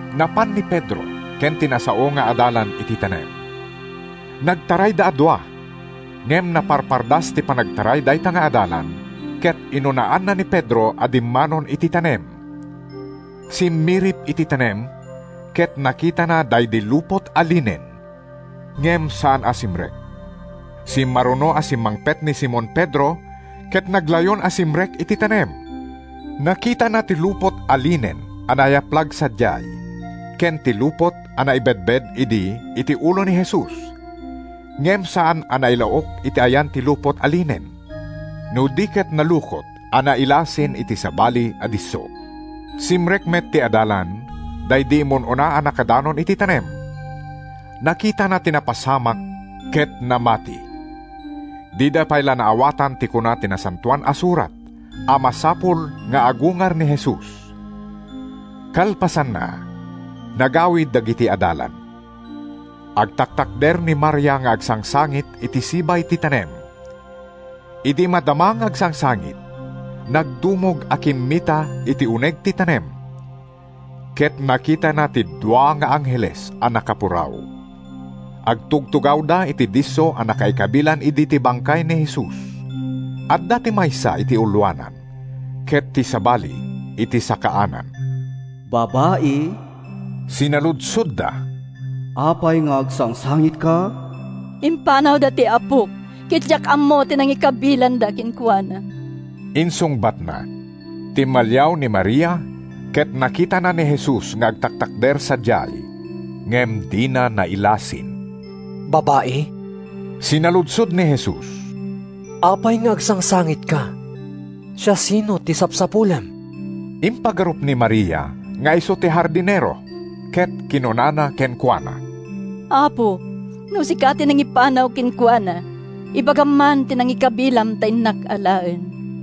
Napan ni Pedro ken ti nasao nga adalan iti tanem. Nagtarayda a dua, ngem naparpardas ti panagtaray dayta nga adalan ket inunaanna ni Pedro a dimmanon iti tanem. Simmirip iti tanem, ket nakitana daydi lupot a linen, ngem saan a simrek. Simmaruno a simmangpet ni Simon Pedro ket naglayon a simrek iti tanem. Nakitana ti lupot a linen a nayaplag sadiay, ken ti lupot a naibedbed idi iti ulo ni Jesus, ngem saan a nailaok iti ayan ti lupot a linen, no di ket nalukot a nailasin iti sabali a disso. Simrek met ti adalan, daydi immun-una a nakadanon iti tanem. Nakitana ti napasamak ket namati. ( Dida pay la naawatan ti kuna ti Nasantoan a Surat a masapul nga agungar ni Jesus.) Kalpasanna, nagawid dagiti adalan. Agtaktakder ni Maria nga agsangsangit iti sibay ti tanem. Idi madama nga agsangsangit, nagdumog a kimmita iti uneg ti tanem, ket nakitana ti dua nga angheles a nakapuraw. Agtugtugawda iti disso a nakaikabilan idi ti bangkay ni Jesus. Adda ti maysa iti uloanan ket ti sabali iti sakaanan. “Babai,” sinaludsodda, “apay nga agsangsangitka?” “Impanawda ti Apok, ket diak ammo ti nangikabilanda kenkuana!” insungbatna. Timmaliaw ni Maria ket nakitana ni Jesus nga agtaktakder sadiay, ngem dina nailasin. “Babai,” sinaludsod ni Jesus, “apay nga agsangsangitka? Siasino ti sapsapulem?” Impagarup ni Maria nga isu ti hardinero, ket kinunana kenkuana, “Apo, no sika ti nangipanaw kenkuana, ibagam man ti nangikabilam ta innak alaen.”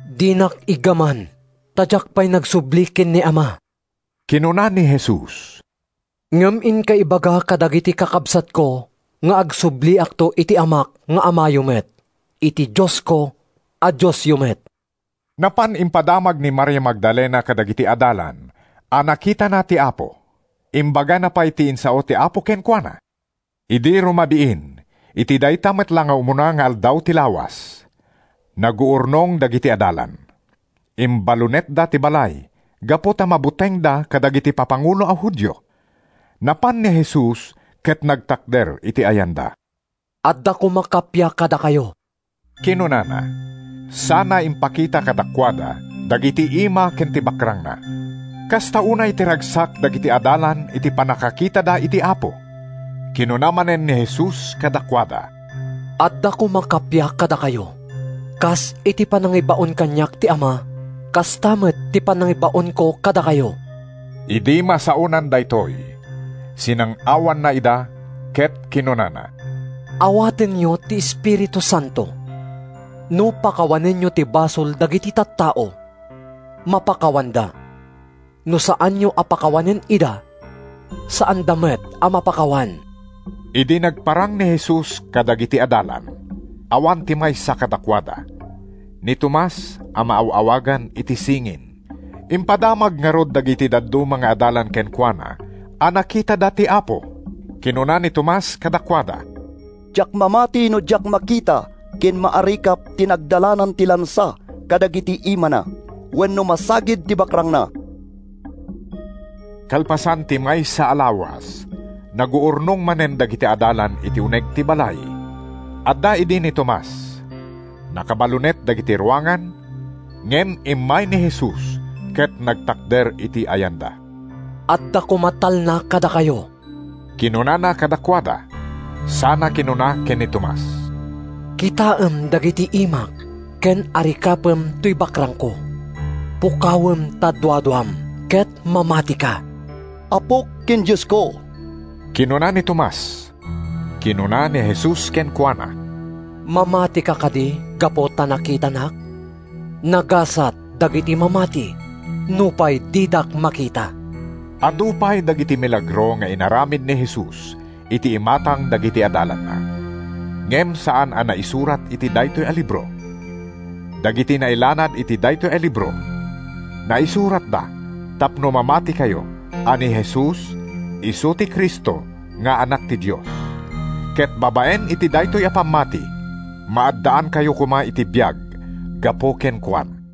“Dinak iggaman, ta diak pay nagsubli ken ni Ama,” kinuna ni Jesus. “Ngem inka ibaga kadagiti kakabsatko nga agsubliakto iti Amak nga Amayo met, iti Diosko a Diosyo met.” Napan impadamag ni Maria Magdalena kadagiti adalan a nakitana ti Apo. Imbagana pay ti insao ti Apo kenkuana. Idi rumabiin iti dayta met la nga umuna nga aldaw ti lawas, naguurnong dagiti adalan. Imbalunetda ti balay gapu ta mabutengda kadagiti papangulo a Judio. Napan ni Jesus ket nagtakder iti ayanda. “Adda koma kappia kadakayo,” kinunana, sana impakita kadakuada dagiti imana ken ti bakrangna. Kasta unay ti ragsak dagiti adalan iti pannakakitada iti Apo. Kinuna manen ni Jesus kadakuada, “Adda koma kappia kadakayo. Kas iti panangibaon kaniak ti Ama, kasta met ti panangibaonko kadakayo.” Idi masaonan daytoy, sinang-awanna ida ket kinunana, “Awatenyo ti Espiritu Santo. No pakawanenyo ti basol dagiti tattao, mapakawanda. No saanyo a pakawanen ida, saanda met a mapakawan.” Idi nagparang ni Jesus kadagiti adalan, awan ti maysa kadakuada, ni Tomas a maaw-awagan iti “Singin.” Impadamag ngarud dagiti dadduma nga adalan kenkuana a nakitada ti Apo. Kinuna ni Tomas kadakuada, “Diak mamati no diak makita ken maarikap ti nagdalanan ti lansa kadagiti imana, wenno masagid ti bakrangna.” Kalpasan ti maysa a lawas, naguurnong manen dagiti adalan iti uneg ti balay. Adda idi ni Tomas. Nakabalunet dagiti ruangan, ngem immay ni Jesus ket nagtakder iti ayanda. “Adda koma talna kadakayo,” kinunana kadakuada, sana kinuna ken ni Tomas, “Kitaem dagiti imak ken arikapem toy bakrangko. Pukawem ta duaduam ket mamatika!” “Apok ken Diosko!” kinuna ni Tomas. Kinuna ni Jesus kenkuana, “Mamatika kadi gapu ta nakitanak? Nagasat dagiti mamati nupay didak makita!” Adu pay dagiti milagro nga inaramid ni Jesus iti imatang dagiti adalanna, ngem saan a naisurat iti daytoy a libro. Dagiti nailanad iti daytoy a libro, naisuratda tapno mamatikayo a ni Jesus isu ti Cristo nga Anak ti Dios, ket babaen iti daytoy a pammati, maaddaankayo koma iti biag gapu kenkuana.